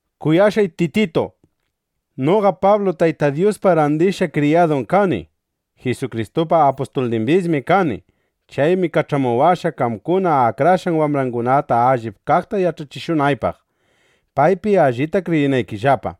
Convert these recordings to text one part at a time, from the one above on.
Kuyashqay Tititu, noqa Pablum Tayta Dyuspa randishqa kriyadun kani. Jisukristupa apustulnimbismi kani. Chaymi kach'amuwashqa, qamkuna akrashqan wambrangunata allip kaqta yach'achishunaypaq, paypi allita kriyinaykillapa,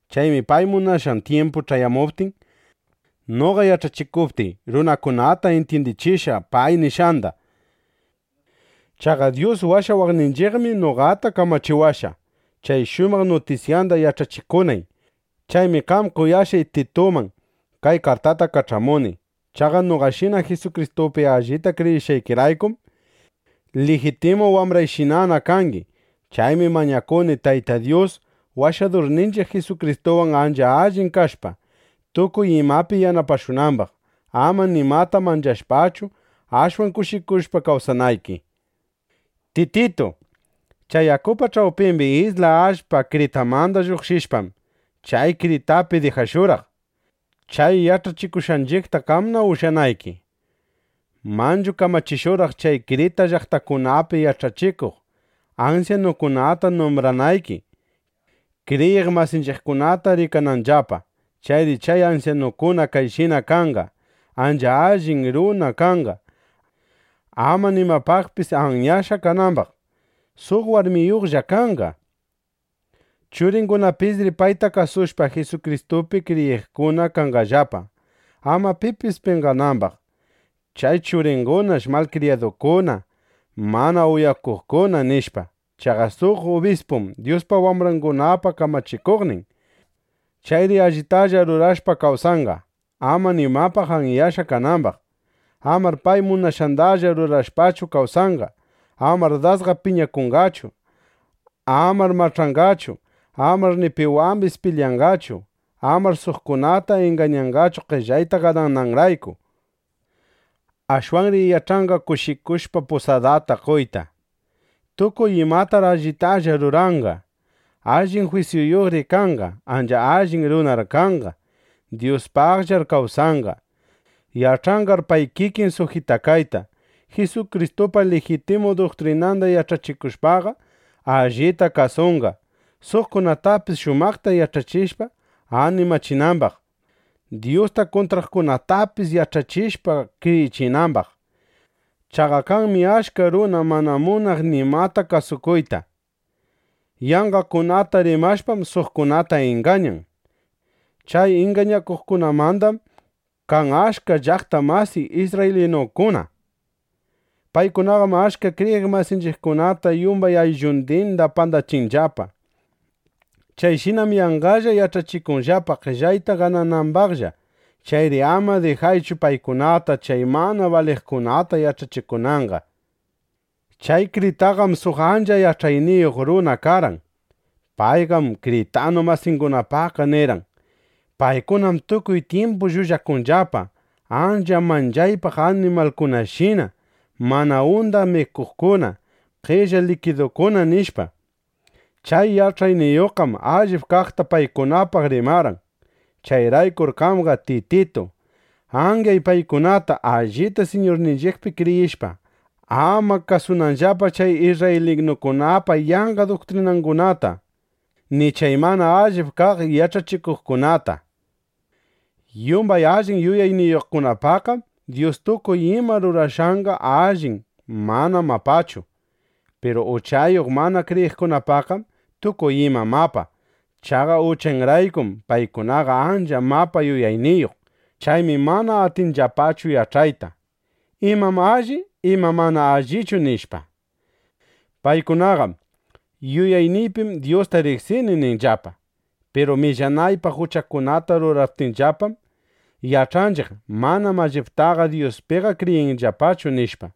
Chaymi pay munashqan tyimpu ch'ayamuptin, noqa yach'achikuptiy, runakunata intyindichishqa pay nishqanda. Chaqa Dyus Washawaqninchiqmi noqata kamachiwashqa, chay shumaq nutisyanda yach'achikunay. Chaymi qam kuyashqay Tituman kay kartata kach'amuni. Chaqa noqashina Jisukristupi allita kriyishqaykiraykum, lijitimu wambrayshina kangi. Chaymi mañakuni, Tayta Dyus, Washadurninchiq Jisukristuwan ancha allin kashpa, tukuy imapi yanapashunambaq, ama nimata manchashpachu, ashwan kushikushpa kawsanayki. Tititu, chay yakupa ch'awpimbi isla allpa Kritamanda lluqshishpam, chay Kritapi dijashurqaq, chay yach'achikushqanchiqta qamna ushyanayki. Manchu kamachishurqaq chay Kritapa llaqtangunapi yach'achikuq ansyanukunata numbranayki, kriyiq masinchiqkunata rikananllapa. Chayri chay ansyanukuna kayshina kanqa: Ancha allin runa kanqa, ama nimapaqpis anyashqa kanambaq. Suq warmiyuqlla kanqa. Churingunapisri payta kasushpa, Jisukristupi kriyiqkuna kanqallapa, ama pipis penqanambaq: Chay churingunash malkriyadukuna, mana uyakuqkuna, nishpa. Chaqa suq ubispum Dyuspa wambrangunapa kamachikuqnin. Chayri allitalla rurashpa kawsanqa, ama nimapaq anyashqa kanambaq. Amar pay munashqandalla rurashpachu kawsanqa. Amar dasqa piñakunqachu. Amar mach'anqachu. Amar ni piwambis pilyanqachu. Amar suqkunata ingañanqachu qellayta ganananrayku. Ashwanri yach'anqa kushikushpa pusadata qoyta. Tukuy imatar allitalla ruranqa. Allin jwisyuyuqri kanqa. Ancha allin runar kanqa. Dyuspaqllar kawsanqa. Yach'anqar pay kikin sujitakayta. Jisukristupa lijitimu duktrinanda yach'akushpaqa, allita kasunqa, suqkunatapis shumaqta yach'achishpa, animachinambaq, Dyusta kuntraqkunatapis yach'achishpa, kriyichinambaq. Chaqa kanmi achka runa mana munaq nimata kasukuyta. Yanqakunata rimashpam, suqkunata ingañan. Chay ingañaqkunamandam kan achka llaqta masiy isrraylinukuna. Paykunaqam achka kriyiq masinchiqkunata yumbay ayllundinda pandachinllapa. Chayshinam yanqalla yach'achikunllapa, qellayta gananambaqlla. Chayri ama dijaychu paykunata, chay mana baliqkunata yach'achikunanqa. Chay Kritapiqam suq ancha yach'ayniyuq runa karqan. Payqam kritanu masingunapaqqa nirqan: “Paykunam tukuy tyimpu llullakunllapa, ancha manchaypaq animalkunashina, mana undaq mikuqkuna, qella likidukuna”, nishpa. Chay yach'ayniyuqqam allip kaqta paykunapaq rimarqan. Chayraykur qamqa Tititu, anyay paykunata, allita Siñurninchiqpi kriyishpa, ama kasunanllapa chay isrraylinukunapa yanqa duktrinangunata, ni chay mana allip kaq yach'achikuqkunata. Yumbay allin yuyayniyuqpaqqam Dyus tukuy ima rurashqanqa allin; manam mapachu. Piru uchayuq mana kriyiqkunapaqqam tukuy ima mapa. Chaqa uchanraykum paykunaqa ancha mapa yuyayniyuq. Chaymi mana atinllapachu yach'ayta: ¿Imam alli, imam mana allichu? nishpa. Paykunaqam: “Yuyayniypim Dyusta riqsini”, ninllapa. Piru millanaypaq uchakunata ruraptinllapam, yach'anchiq: Manam alliptaqa Dyuspiqa kriyinllapachu, nishpa.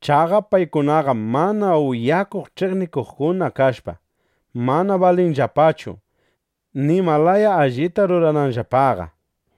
Chaqa paykunaqam mana uyakuq ch'iqnikuqkuna kashpa, mana balinllapachu, nima laya allita rurananllapaqa.